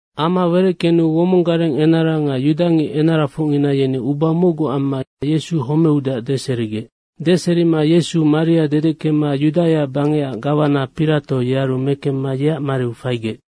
Ama wereckenu womong gareng enara nga yudangic enarafocngina yeni uba mocgu amma Yesu homeudeac deserigec. Deserima Yesu maria dedeckema Yudaia bangecac gawana Pirato, yearu mekemma yeac mariu faigec.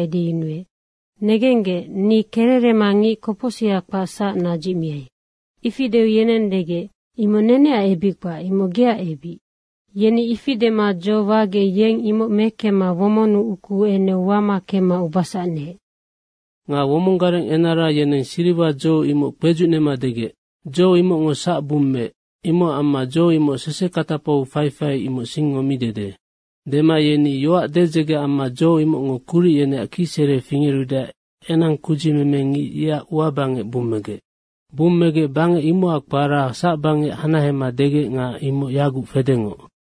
edeyunuec, “Negenggec, ni kererema ngic kopocsiha kpac, ye sac nadzicmiai.” Ifi deu yeneng degec, “Imoc neneac ebic kpac, imoc geac ebic.” Yeni ifi dema dzo wagec, yeng imoc mekemma womonnu ukuu enu wama kemma ubasac neec. Nga womong gareng enara yeneng siriwa dzo imoc kpedzucnema degec, “Dzo imocngo sac bummeec. Imocac amma dzo imoc sesekatapau faifai, imoc singngo mi dede.” Dema yeni yoac dedzege amma dzo imocngo kuric yeneac kicsere fingerudeac enang kudzimemengic yeac ua bangec bummegec. Bummegec bangec imocac kpara Sacbangec hanahema degec nga imoc yaguc fedengoc.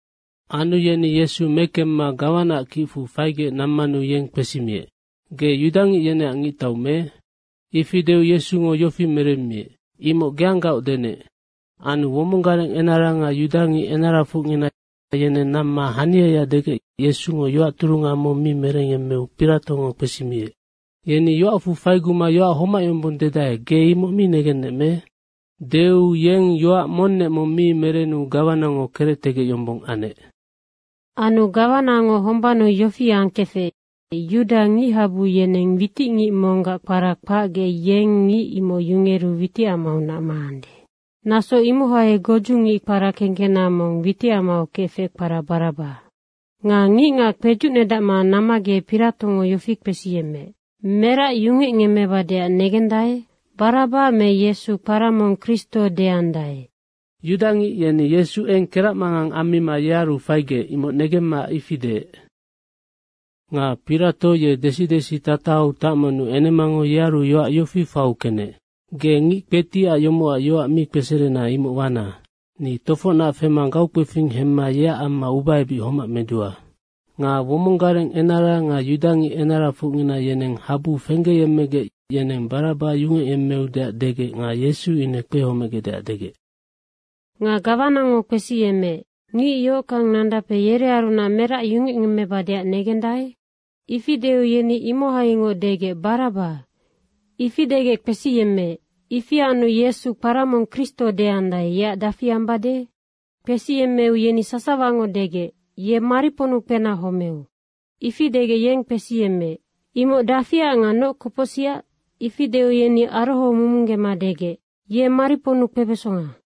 Anu yeni Yesu mekemma gawanaac kicfu faigec nammanu yeng kpesimiec, “Ge yudangic yeneac ngictau me?” Ifi deu Yesungo yofi meremmiec, “Imocnoc geanggaoc denec.” Anu womong gareng enara nga yudangic enarafocngina yeneng namma haniaya degec Yesungo yoac turunga mong mi merengyemmeu Piratongo kpesimiec, “Yeni yoacfu faiguma yoac homac yombong dedae, ge imoc mi negennec me?” Deu yeng yoac monnec mong mi merenu gawanango kerectegec yombong anec. Anu gawanango hombannu yofi angkefec, yuda ngichabu yeni witicngic monggac kpara kpacgec, yeng ngic imoc yungeru witicamaunac maande. Naso imohai godzungic kpara kekena mong witicamau kefec, kpara Baraba. Nga ngicngac kpedzucnedacma nammagec Piratongo yofi kpesiyemmeec, “Merac yungecngemmebadeac negendae, Baraba me Yesu, kpara mong Kristo deandae?” Yudangic yeni Yesu eng keracmangang ammima yearu faigec, imoc negemmanoc ifi deec. Nga Pirato ye desi desi tatahau tacmanu enemango yearu yoac yofi faiu kenec, “Ge ngic kpetiac yomocac yoac mi kpeserena, imoc wana. Ni tofocnac fema gaukpefing hemma yeac amma ubaebic homac medua.” Nga womong gareng enara nga yudangic enarafocngina yeneng habu fenggeyemmegec yeneng Baraba yungecyemmeudeac degec nga Yesu ine kpehomegecdeac degec. Nga gawanango kpesiyemmeec, “Ngic yohockang nandape yerearunac merac yungecngemmebadeac negendae?” ifi deu yeni imohaingoc degec, “Baraba.” Ifi degec kpesiyemmeec, “Ifi anu Yesu, kpara mong Kristo deandae, yeac dafi ambade?” Kpesiyemmeu yeni sasawango degec, “Ye mariponnu kpena homeu.” Ifi degec, yeng kpesiyemmeec, “Imoc dafiac nga noc kopocsicac?” Ifi deu yeni arohomumunggema degec, “Ye mariponnu kpebesonga.”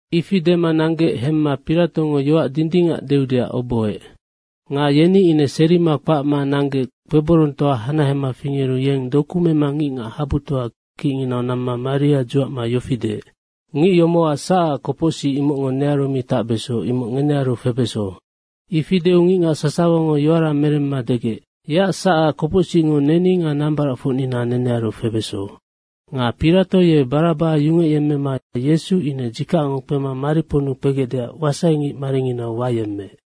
Ifi dema nanggec hemma Piratongo yoac dindingac deudeac obohoec. Nga yeni ine serima kpacma nanggec kpeborongtoa hanahema fingeru yeng doku mema ngicngac habutoa kicnginau namma maria dzuacma yofi deec, “Ngic yomocac sacac kopocsic, imocngo nearu mi tacbeso, imoc ngenearu febeso.” Ifi deu ngicngac yeni sasawango yoara meremma degec, “Yeac sacac kopocsicngo neni nga nambaracfocnina nenearu febeso.” Nga Pirato ye Baraba yungecyemmema Yesu ine dzikacngo kpema mariponnu kpegecdeac wasaingic maringinau wayemmeec.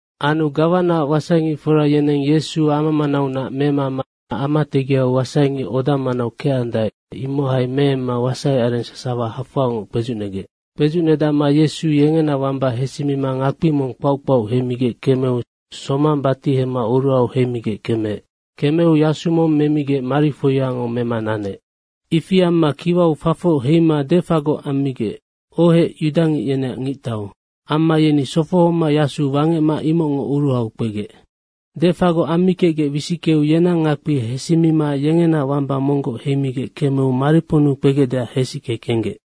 Anu gawanaac wasaingicfora yeneng Yesu ama manaunac memama ama tegiau wasaingic oda manau kecandae, imohai meemma wasaiareng sasawa hafoangoc kpedzucnegec. Kpedzucnedacma Yesu yengena wamba hesimima ngakpi mong kpauc kpauc heimigec kemeu somang batihema oruhau heimigec kemeec. Kemeu yasu mong memigec marifoiango mema nanec. Ifi amma kiwau fafoc heima defagoc ammigec, “Ohec, yudangic yeneac ngictau.” Amma yeni sofohoma yasu wangecma imocngo oruhau kpegec. Defagoc ammikecgec wisickeu yenang ngakpi hesimima yengena wamba monggoc heimigec kemeu mariponnu kpegecdeac hesicke kenggec.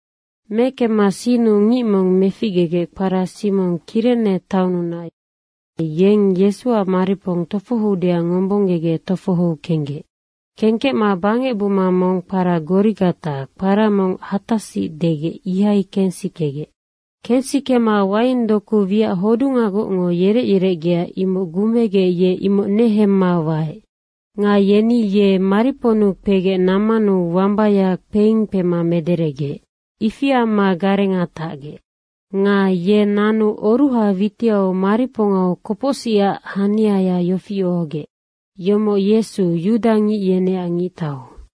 Mekemma sinnu ngic mong meficgegec, kpara Simong, Kirene taonnunac, yeng Yesuac maripong tofohoudeac ngombonggegec tofohou kenggec. Kengkecma bangec buma mong kpara Gorigata, kpara mong Hatasic degec, ihai kensikegec. Kensikema waing doku wiac hodungagocngo yerec yerecgea, imoc gumegec ye imoc nenegemma waec. Nga yeni ye mariponnu kpegec nammanu wambaya kpeing kpema mederegec. Ifi amma garenga tacgec. Nga ye nanu oruha witiau maripongau kopocsicac haniaya yofi ohogec, “Yomoc Yesu, yudangic yeneac ngictau.”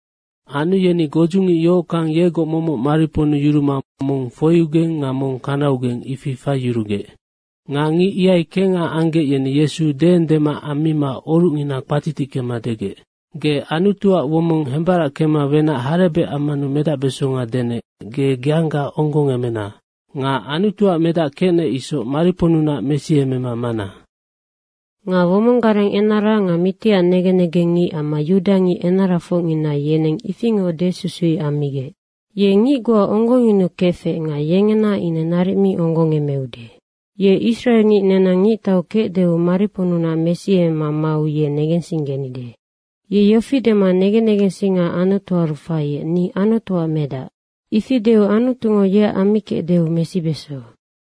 Anu yeni godzungic yohockang yegoc momoc mariponnu yuruma mong foiugeng nga mong kanaugeng, ifi faiyurugec. Nga ngic ihai kengha anggec, yeni Yesu deengdema ammima orucngina kpatitickema degec, “Ge Anutuac womong hembarackema wenac harebec ammanu medacbesonga denec, ge geangga onggongemena. Nga Anutuac medac kecnec isoc mariponnunac mesiemema mana.” Nga womong gareng enara nga mitiac negen negengngic amma yudangic enarafocngina yeneng ifingoc desusuic ammigec, “Ye ngic goa onggongyunukefec nga yengena ine naric mi onggongemeude. Ye israengic nenang ngictau kecdeu mariponnunac mesiemema mau ye negensinggenide. Ye yofi dema negen negensinga Anutuaru faiec, ‘Ni Anutuac medac.’ ifi deu Anutungo yeac ammikecdeu mesibeso.”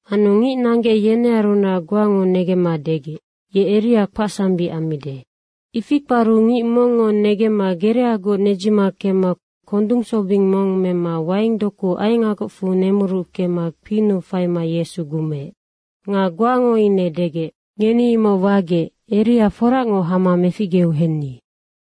Anu ngic nanggec, yenearunac goango negemma degec, “Ye Eria kpacsambic ammide.” Ifi kparu ngic mongngo negemma gereagoc nedzima kemma kondung sobing mong mema waingdoku aengagocfu nemuruckema kpinnu faima Yesu gumeec. Nga goango ine degec, “Ngeni imoc wagec, Eria foracngoc hama meficgeu henni.”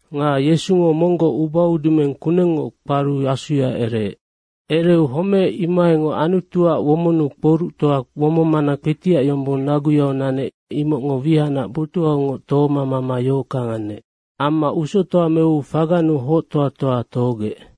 Nga Yesungo monggoc ubaudumeng kunengngoc kparu asuya ereec. Ereu homeec, imohaingoc Anutuac womonnu kpoructoa womongmana kpetiac yombong naguyau nanec, imocngo wihacnac botuhaungoc tohoma mama yohockang anec. Amma usoctoa meu fagannu hoctoa toa tohogec.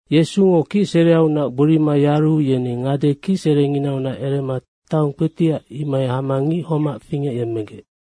Yesungo kicsereaunac gborima yaru yeni ngade kicserenginaunac erema taong kpetiac, imohai hama ngic homac fingecyemmegec.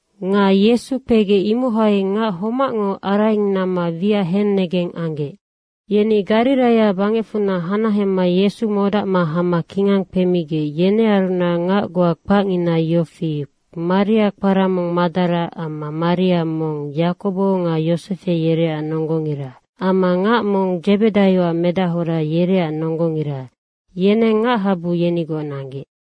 Nga Yesu kpegec, imohai ngac homacngo araing namma wiac hennegeng anggec. Yeni Gariraia bangecfunac hanahema Yesu modacma hama kingang kpemigec, yenearunac ngac goa kpacngina yofi, Maria kpara mong Madara amma Maria mong, Yakobo nga Yosefe, yereac nonggongira amma ngac mong Dzebedaioac medahora, yereac nonggongira, yeneng ngachabu yenigoc nanggec.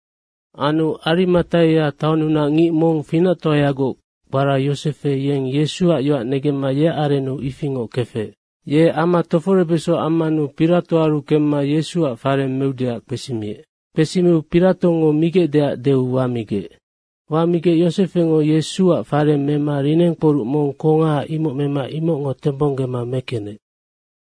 Anu Arimataia taonnunac ngic mong finactoayagoc, kpara Yosefe, yeng Yesuac yoac negemma yeac arennu ifingoc kefec. Ye ama toforebeso ammanu Piratoaru kemma Yesuac fareng meudeac kpesimiec. Kpesimiu Piratongo migecdeac deu wamigec. Wamigec Yosefengo Yesuac farenga mema linengkporuc mong kongaha, imoc mema imocngo tembonggema mekenec.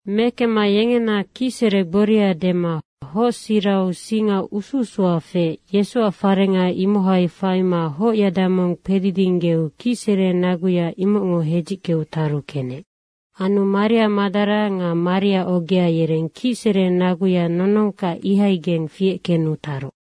Mekemma yengena kicsere gboria dema hocsirau singa usu usuya feec, Yesuac fareng imohai faima hocyada mong kpedidinggeu kicsere naguya imocngo hedzickeu taru kenec. Anu Maria Madara nga Maria ogea yereng kicsere naguya nonongkac ihaigeng fiec kenu taroc.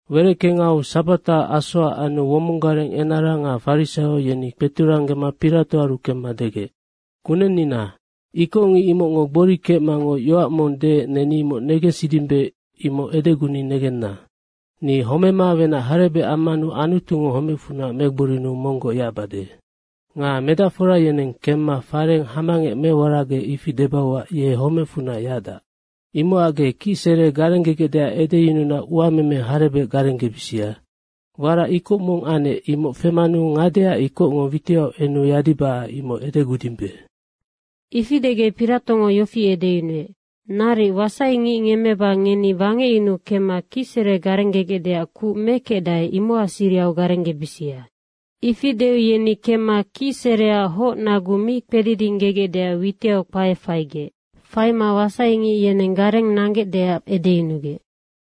Wereckengau sabata asoac anu womong gareng enara nga farisaio yeni kpeturanggema Piratoaru kemma degec, “Kunennina, ikocngic imocngo gbori kecmangoc, yoac mong deec, neni imoc negensidimbe, imoc edeguni negenna, ‘Ni homema wenac harebec ammanu Anutungo homecfunac megborinuu monggoc yacbade.’ Nga medacfora yeneng kemma farenga hamangec meworagec, ifi debauac, ‘Ye homecfunac yacdac.’ imocac ge kicsere garenggegecdeac edeyununa uameme harebec garenggebisia. Warac ikoc mong anec, imoc femanu ngadeac ikocngo witiau enu yadibacac imoc edegudimbe.” Ifi degec Piratongo yofi edeyunuec, “Naric, wasaingic ngemmeba ngeni wangecyunu kemma kicsere garenggegecdeac kuc mekecdae, imocac sirihau garenggebisia.” Ifi deu yeni kemma kicsereac hocnagu mi kpedidinggegecdeac witiau kpae faigec. Faima wasaingic yeneng gareng nanggecdeac edeyunugec.